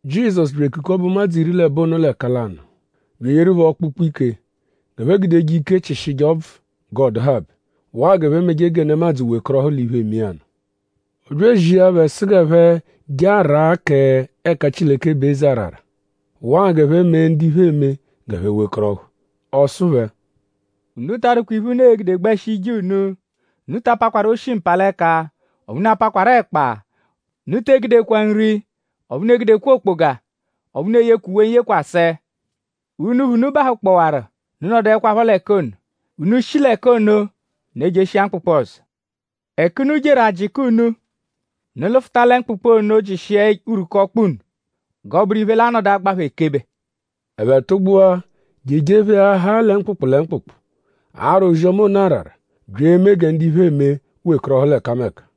Jizọsu bya ekukọbe ụmadzu iri l'ẹbo ono l'ẹka lanụ; bya eyeru phẹ ọkpukpu-ike g'ẹphe gudeje ike chịshije ọbvu g'ọ dụhabe; waa g'ẹphe meje gẹ nemadzụ wekọrohu l'iphe, eme iya nụ. Ọ bya ezia phẹ sụ g'ẹphe je araa k'ẹka Chileke bụ eze arara; waa g'ẹphe mee ndu iphe eme g'ẹphe wekọrohu. Ọ sụ phẹ: “Unu ta adụkwa iphe, unu e-gude gbẹshi ije unu. Unu ta apakwaru oshi-mpalẹka; ọphu unu apakwaru ẹkpa. Unu te egudekwa nri; ọphu unu egudekwa okpoga. Ọphu unu eyekwa uwe n-yekwasẹ. Unuphu, unu bahụkpowaru; unu nọduekwapho l'ẹka ono. Unu -shi l'ẹka ono unu ejeshia mkpụkpu ọzo. Ẹka unu jeru; a -jịka unu; unu lụfuta lẹ mkpụkpu ono jịshia urwuku ọkpa unu g'ọ bụru iphe, l'a-nọdu agba phẹ ekebe.” Ẹphe tụgbua je ejepheahaa lẹ mkpụkpu lẹ mkpụkpu; ara ozi-ọma ono arara; bya eme gẹ ndu iphe eme wekọrohu l'ẹkameka.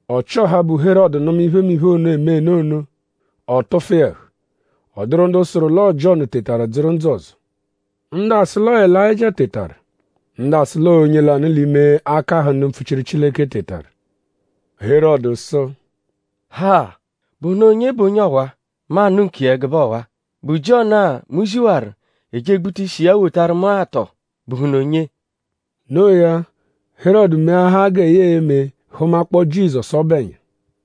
Ọchi-ọha, bụ Herọdu nụma iphemiphe ono, emenu ono; ọ tụfu iya ẹhu. Ọ dụru ndu sụru l'ọo Jiọnu tetaru dzụru ndzụ ọzo. Ndu asụ l'ọo Elayịjia tetaru; ndu asụ l'ọo onye lanụ l'ime akahụ ndu mpfuchiru Chileke tetaru. Herọdu sụ: “Ha!?Bụhunu onye bụ onye ọwa-a, mu anụ nkiya ẹgube ọwa??Bụ Jiọnu-a, mu ziwaru; e je egbuta iya ishi wotaru mu-a; tọo?bụhunu onye?” No iya; Herọdu meahaa gẹ ya e-me hụmakpoo Jizọsu ọbu ẹnya.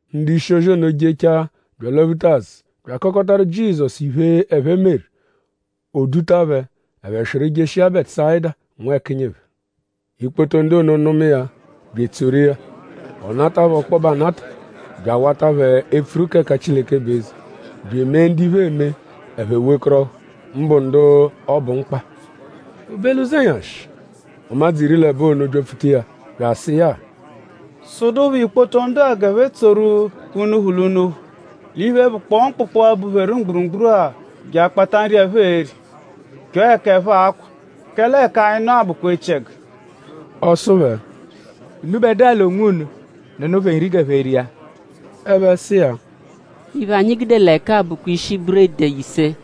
Ndu-ishi-ozi ono jechaa bya alwaphuta azụ bya akọkotaru Jizọsu iphe, ẹphe meru. O duta phẹ; ẹphe swịru jeshia Bẹtusayida nwẹkinyi phẹ. Ikpoto ndu ono nụma iya bya etsoru iya. Ọ nata phẹ ọkpobe anata bya awata phẹ epfuru k'ẹka Chileke bụ eze; bya emee ndu iphe eme; ẹphe wekọrohu; mbụ ndu ọ bụ mkpa. O be l'ụzenyashi; ụmadzu iri l'ẹbo ono byapfuta iya bya asụ iya: “Sụdupho ikpoto ndu-a g'ẹphe tsoru unuphu l'unuphu l'iphe, bụkpoo mkpụkpu-a, bupheru mgburugburu-a je akpata nri, ẹphe e-ri; chọo ẹka ẹphe a-kwa; kẹle ẹka-a, anyi nọ-a bụkwa echiẹgu.” Ọ sụ phẹ: “Unubẹdua l'onwunu nụnu phẹ nri g'ẹphe ria.” Ẹphe sụ iya: “Iphe, anyi gude l'ẹka-a bụkwa ishi buredi ise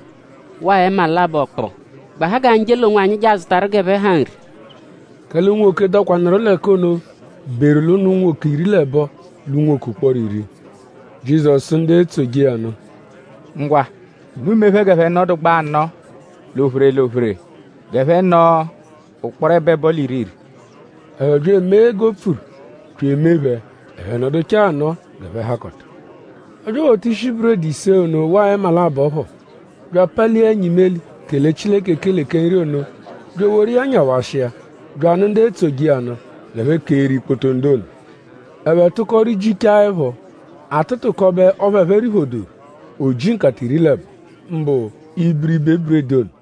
waa ẹma labọ kpụu; gbahaa g'anyi je l'onwanyi je azụtaru g'ẹphe ha nri.” Kẹle unwoke, dọkwanuru l'ẹka ono beru l'ụnu unwoke iri l'ẹbo l'unwoke ụkporo iri. Jizọsu sụ ndu etsoje iya nụ: “Ngwa; unu mee phẹ g'ẹphe nọdugbaa anọo l'ophere l'ophere; g'ẹphe nọo ụkporo ẹbo-ẹbo l'iri-iri.” Ẹphe bya emee g'o pfuru bya emee phẹ; ẹphe nọduchaa anọo g'ẹphe hakọta. Ọ bya ewota ishi buredi ise ono waa ẹma labọ phọ; bya apalia ẹnya imeli kele Chileke ekele kẹ nri ono; bya eworu iya nyawashia; bya anụ ndu etsoje iya nụ g'ẹphe keeru ikpoto ndu ono. Ẹphe tụko rijichaa ẹpho. A tụtukobe ọphu ẹphe riphodoru; o ji nkata iri l'ẹbo; mbụ ibiribe buredi ono.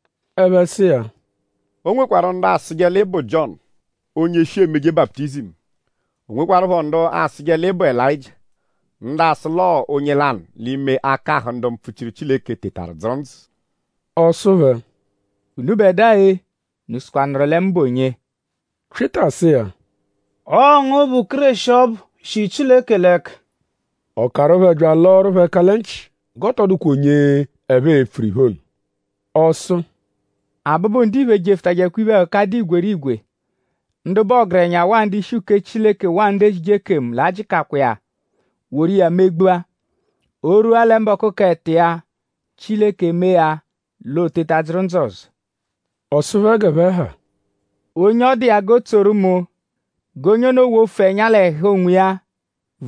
Ẹphe sụ iya: “O nwekwarụ ndu asụje l'ị bụ Jiọnu, onye shi emeje baputizimu. O nwekwarụpho ndu asụje l'ị bụ Elayịjia. Ndu asụ l'ọo onye lanụ l'ime akahụ ndu mpfuchiru Chileke tetaru dzụru ndzụ.” Ọ sụ phẹ: “Unubẹdua-e;?Unu sụkwanuru lẹ mu bụ onye?” Pyịta sụ iya: “Ọo ngu bụ Kéreshi ọbu, shi Chileke l'ẹka.” Ọ karụ phẹ bya alọoru phẹ ẹka lẹ nchị g'ọ tọ dụkwa onye ẹphe e-pfuru iphe ono. Ọ sụ: “Abụbu-Ndiphe jefụtajekwa iphe-ẹhuka, dụ igwerigwe; ndu bụ ọgerenya; waa ndu-ishi uke Chileke; waa ndu ezije ekemu l'a-jịkakwa iya woru iya megbua. O -rwua lẹ mbọku k'ẹto iya Chileke emee ya l'o teta dzụru ndzụ ọzo.” Ọ sụ phẹ g'ẹphe ha: “Onye ọ dụ iya g'o tsoru mu; g'onye ono wofu ẹnya l'ẹhu onwiya;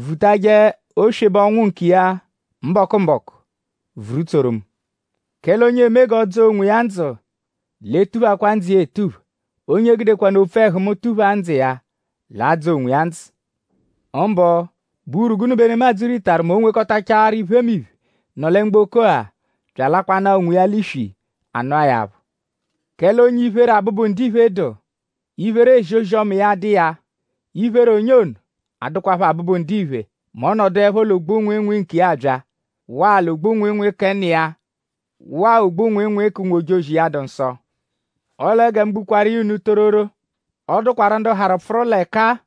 vutajẹ oswebe ọnwu nkiya mbọku-mbọku vuru tsoru mu. Kẹle onye eme g'ọ dzọo onwiya ndzụ l'e-tuphakwa ndzụ iya etupha. Onye gudekwanụ opfu ẹhu mu tuphaa ndzụ iya l'a-dzọ onwiya ndzụ. Mbụ?bụ gụnu bụ urwu, nemadzụ ritaru mẹ o -nwekọtachaaru iphemiphe, nọ lẹ mgboko-a bya alakwanaa onwiya l'iswi; a nụa ya aphụ? Kẹle onye iphere Abụbu-Ndiphe dụ; iphere ezi ozi-ọma iya dụ iya; iphere onye ono a-dụkwapho Abụbu-Ndiphe mẹ ọ -nọduepho l'ogbu-nwịinwii nkiya abya; waa l'ogbu-nwịinwii kẹ Nna iya; waa ogbu-nwịinwii k'ụnwu-ojozi iya, dụ nsọ. Ọle gẹ mu gbukwaaru iya unu tororo; ọ dụkwaru ndu harụ pfụru l'ẹka-a,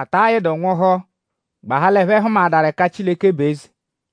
ata yịdu nwụhu; gbahaa l'ẹphe hụmaadaru ẹka Chileke bụ eze.”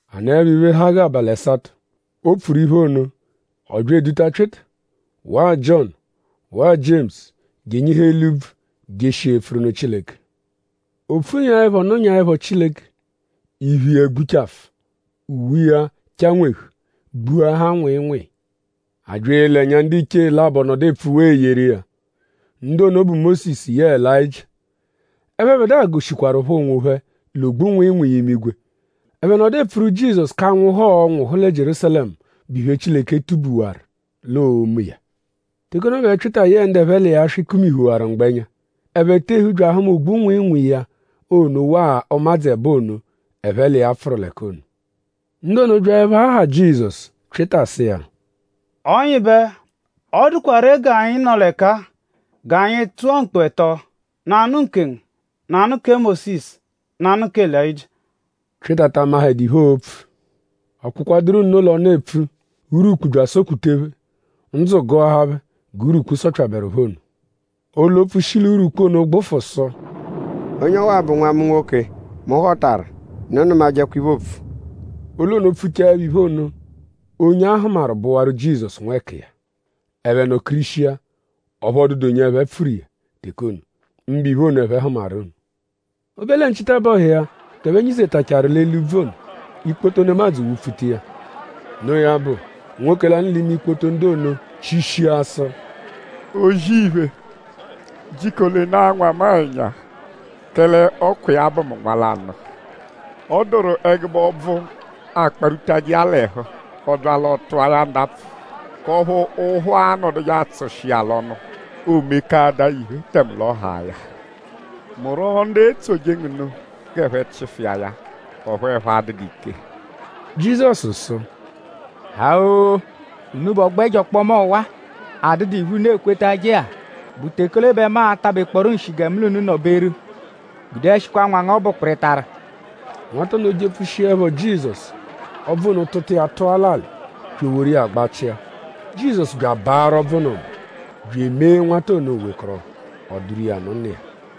“A nọepho iphe, ha g'abalị ẹsato, o pfuru iphe ono; ọ bya eduta Pyịta; waa Jiọnu; waa Jiemusu je enyihu eli úbvú; jeshia epfuru nụ Chileke. O pfunyaẹpho nụnyaepho Chileke; iphu iya gbuchafụ; uwe iya chanwehụ; gbuahaa nwịinwii. A bya ele ẹnya; ndiche labọ nọdu epfuwaa eyeru iya. Ndu ono bụ Mósisu yẹe Elayịjia. Ẹphebedua goshikwaruphọ onwophẹ l'ogbu-nwịinwii imigwe. Ẹphe nọdu epfuru Jizọsu k'anwụhu, ọo-nwụhu lẹ Jierúsalẹmu, bụ iphe, Chileke tubuwarụ l'oo-me iya. Teke ono bẹ Pyịta yẹe ndu ẹphe l'iya swị kumihuwaru mgbẹnya. Ẹphe tehu bya ahụma ogbu-nwịinwii ya ono waa ụmadzu ẹbo ono, ẹphe l'iya pfụru l'ẹka ono. Ndu ono byaẹpho aha Jizọsu; Pyịta sụ iya: Ọnyibe; ọ dụkwa ree g'anyi nọ l'ẹka-a; g'anyi tụa mkpu ẹto: nanụ nkengu; nanụ kẹ Mósisu; nanụ kẹ Elayịjia.” Pyịta ta amahẹdu iphe, oopfu. Ọ kpụkwaduru nno l'ọnu epfu; urwukpu bya asọ-kputa phẹ. Ndzụ gụahaa phẹ g'urwukpu sọpyaberu phẹ ono. Olu-opfu shi l'urwukpu ono gbụfu sụ: “Onye ọwa-a bụ Nwa mu nwoke, mu họtaru. Unu nụmajekwa iphe, oopfu!” Olu ono pfuchaẹpho iphe ono; onye a hụmaru bụwaru Jizọsu nwẹkiya. Ẹphe nọ-kirishia; ọphu ọ dụdu onye ẹphe pfuru iya teke ono; mbụ iphe ono, ẹphe hụmaru ono. O be lẹ nchitabọhu iya g'ẹphe nyizetachaaru l'eli úbvú ono; ikpoto nemadzụ wụ-pfuta iya. Noo ya bụ; nwoke lanụ l'ime ikpoto ndu ono chishia sụ: “O-zì-iphe; jiko lenaa nwa mu-a ẹnya; kẹle ọ kwa iya bụ mu nwa lanụ. Ọ dụru ẹgube ọbvu, akparwutajẹ iya l'ẹhu; ọ -bya l'ọ tụa ya ndapfụ; k'ọphu ụ́phù anọduje atsụshi iya l'ọnu; oomekaadaa ya iphe tẹme l'ọ haa ya. Mu rwọo ndu etsoje ngu nụ g'ẹphe chịfu iya; ọphu ẹphe adụdu ike.” Jizọsu sụ: “Ha-oo! Unubẹ ọgbo ẹjo ọkpoma ọwa-a, adụdu iphe, unu ekwetajẹ-a!?Bụ teke ole bẹ mu a-takpọo nshi gẹ mu l'unu nọ-beru? Gudeẹshikwa nwa ngu ọbu kpịritaru!” Nwata ono jepfushiẹpho Jizọsu; ọbvu ono tụta iya tụa l'alị bya eworu iya gbachịa. Jizọsu bya abaarụ ọbvu ono mba; bya emee nwata ono o wekọrohu. O duru iya nụ nna iya.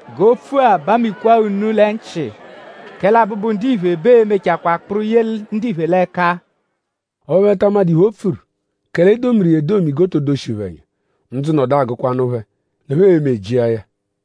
“G'opfu-a bamikwaa unu l'ẹnu-nchị; kẹle Abụbu-Ndiphe bẹ ee-mechakwaa kpụru ye ndiphe l'ẹka.” Ọphu ẹphe ta amadụ iphe, o pfuru; kẹle e domiru iya edomi g'o to doshi phẹ ẹnya. Ndzụ nọdu agụkwanu phẹ g'ẹphe e-me jịa ya.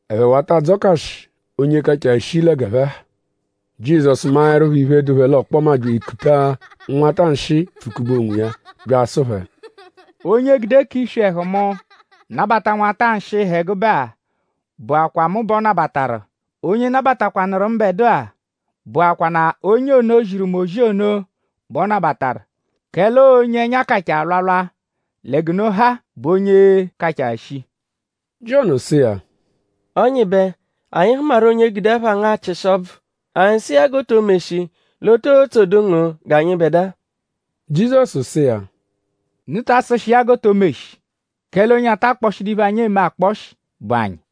Ẹphe wata adzọkashi onye kachaa shii lẹ g'ẹphe ha. Jizọsu maẹrupho iphe, dụ phẹ l'ọkpoma bya ekuta nwata nshịi pfụ-kube onwiya; bya asụ phẹ: “Onye gude k'iswi ẹhu mu nabata nwata nshịi, ha ẹgube-a bụakwaa mu bẹ ọ nabataru. Onye nabatakwanụru mbẹdua; bụakwanaa onye ono, ziru mu ozi ono bẹ ọ nabataru; kẹle ọo onye ẹnya kachaa alwalwa lẹ g'unu ha bụ onye kachaa shii.” Jiọnu sụ iya: “Ọnyibe; anyi hụmaru onye gude ẹpha ngu achịshi ọbvu. Anyi sụ iya g'o to meshi l'o too tsodu ngu g'anyịbedua.” Jizọsu sụ iya: “Unu ta asụshi iya g'o to meshi; kẹle onye ata akpọshidu iphe, anyi eme akpọshi bụ anyi.”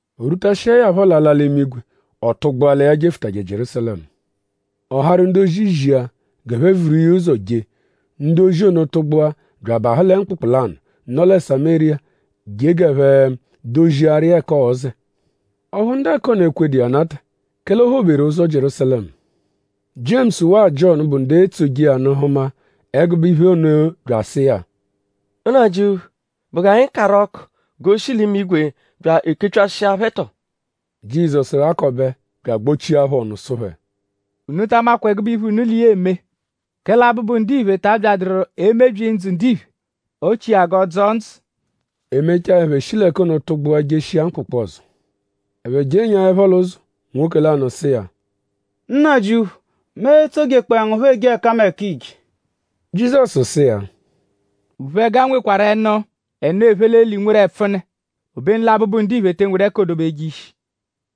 O rwutashiẹ ya phọ l'ala l'imigwe; ọ tụgbua lẹ ya jefụtaje Jierúsalẹmu. Ọ harụ ndu-ozi zia g'ẹphe vuru iya ụzo je. Ndu ozi ono tụgbua bya abahụ lẹ mkpụkpu lanụ, nọ lẹ Samériya je g'ẹphe doziaru iya ẹka ọo-zẹ. Ọphu ndu ẹka ono ekwedu iya anata; kẹle o phoberu ụzo Jierúsalẹmu. Jiemusu; waa Jiọnu, bụ ndu etsoje iya nụ hụma ẹgube iphe ono bya asụ iya: “Nnajịuphu!?Bụ g'anyi karụ ọku g'o shi l'imigwe bya ekepyashịa phẹ tọo?” Jizọsu ghakọbe bya agbochia phẹ ọnu sụ phẹ: “Unu ta amakwa ẹgube iphe, unu l'iya l'eme. Kẹle Abụbu-Ndiphe ta abyadụru emebyi ndzụ ndiphe; ọ chịa g'ọ dzọo ndzụ.” E mechaa; ẹphe shi l'ẹka ono tụgbua jeshia mkpụkpu ọzo. Ẹphe jenyaẹpho l'ụzo; nwoke lanụ sụ iya: “Nnajịuphu; mu e-tsojekpọe ngu phọ eje ẹkameka, iije.” Jizọsu sụ iya: “Uphẹga nwekwarụ ẹnú; ẹnù, ephe l'eli nweru ẹpfune; obenu lẹ Abụbu-Ndiphe te enwedu ẹka oo-dobeje ishi.”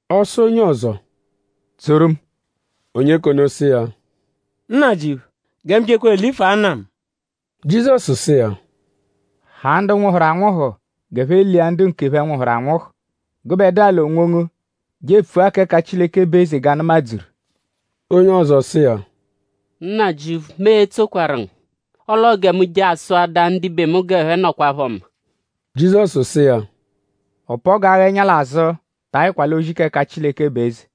Ọ sụ onye ọzo: “Tsoru mu!” Onye k'ono sụ iya: “Nnajịuphu; gẹ mu jekwa elifua nna mu.” Jizọsu sụ iya: “Haa ndu nwụhuru anwụhu g'ẹphe lia ndu nkephẹ, nwụhuru anwụhu. Gụbedua l'onwongu je epfua k'ẹka Chileke bụ eze g'a nụmadzuru.” Onye ọzo sụ iya: “Nnajịuphu; mu e-tsokwaru ngu; ọle ọo gẹ mu je asụadaa ndibe mu g'ẹphe nọkwa-ẹhu mma!” Jizọsu sụ iya: “Ọ-pa-ọgu agha ẹnya l'azụ ta ayịkwa l'ozi k'ẹka Chileke bụ eze.”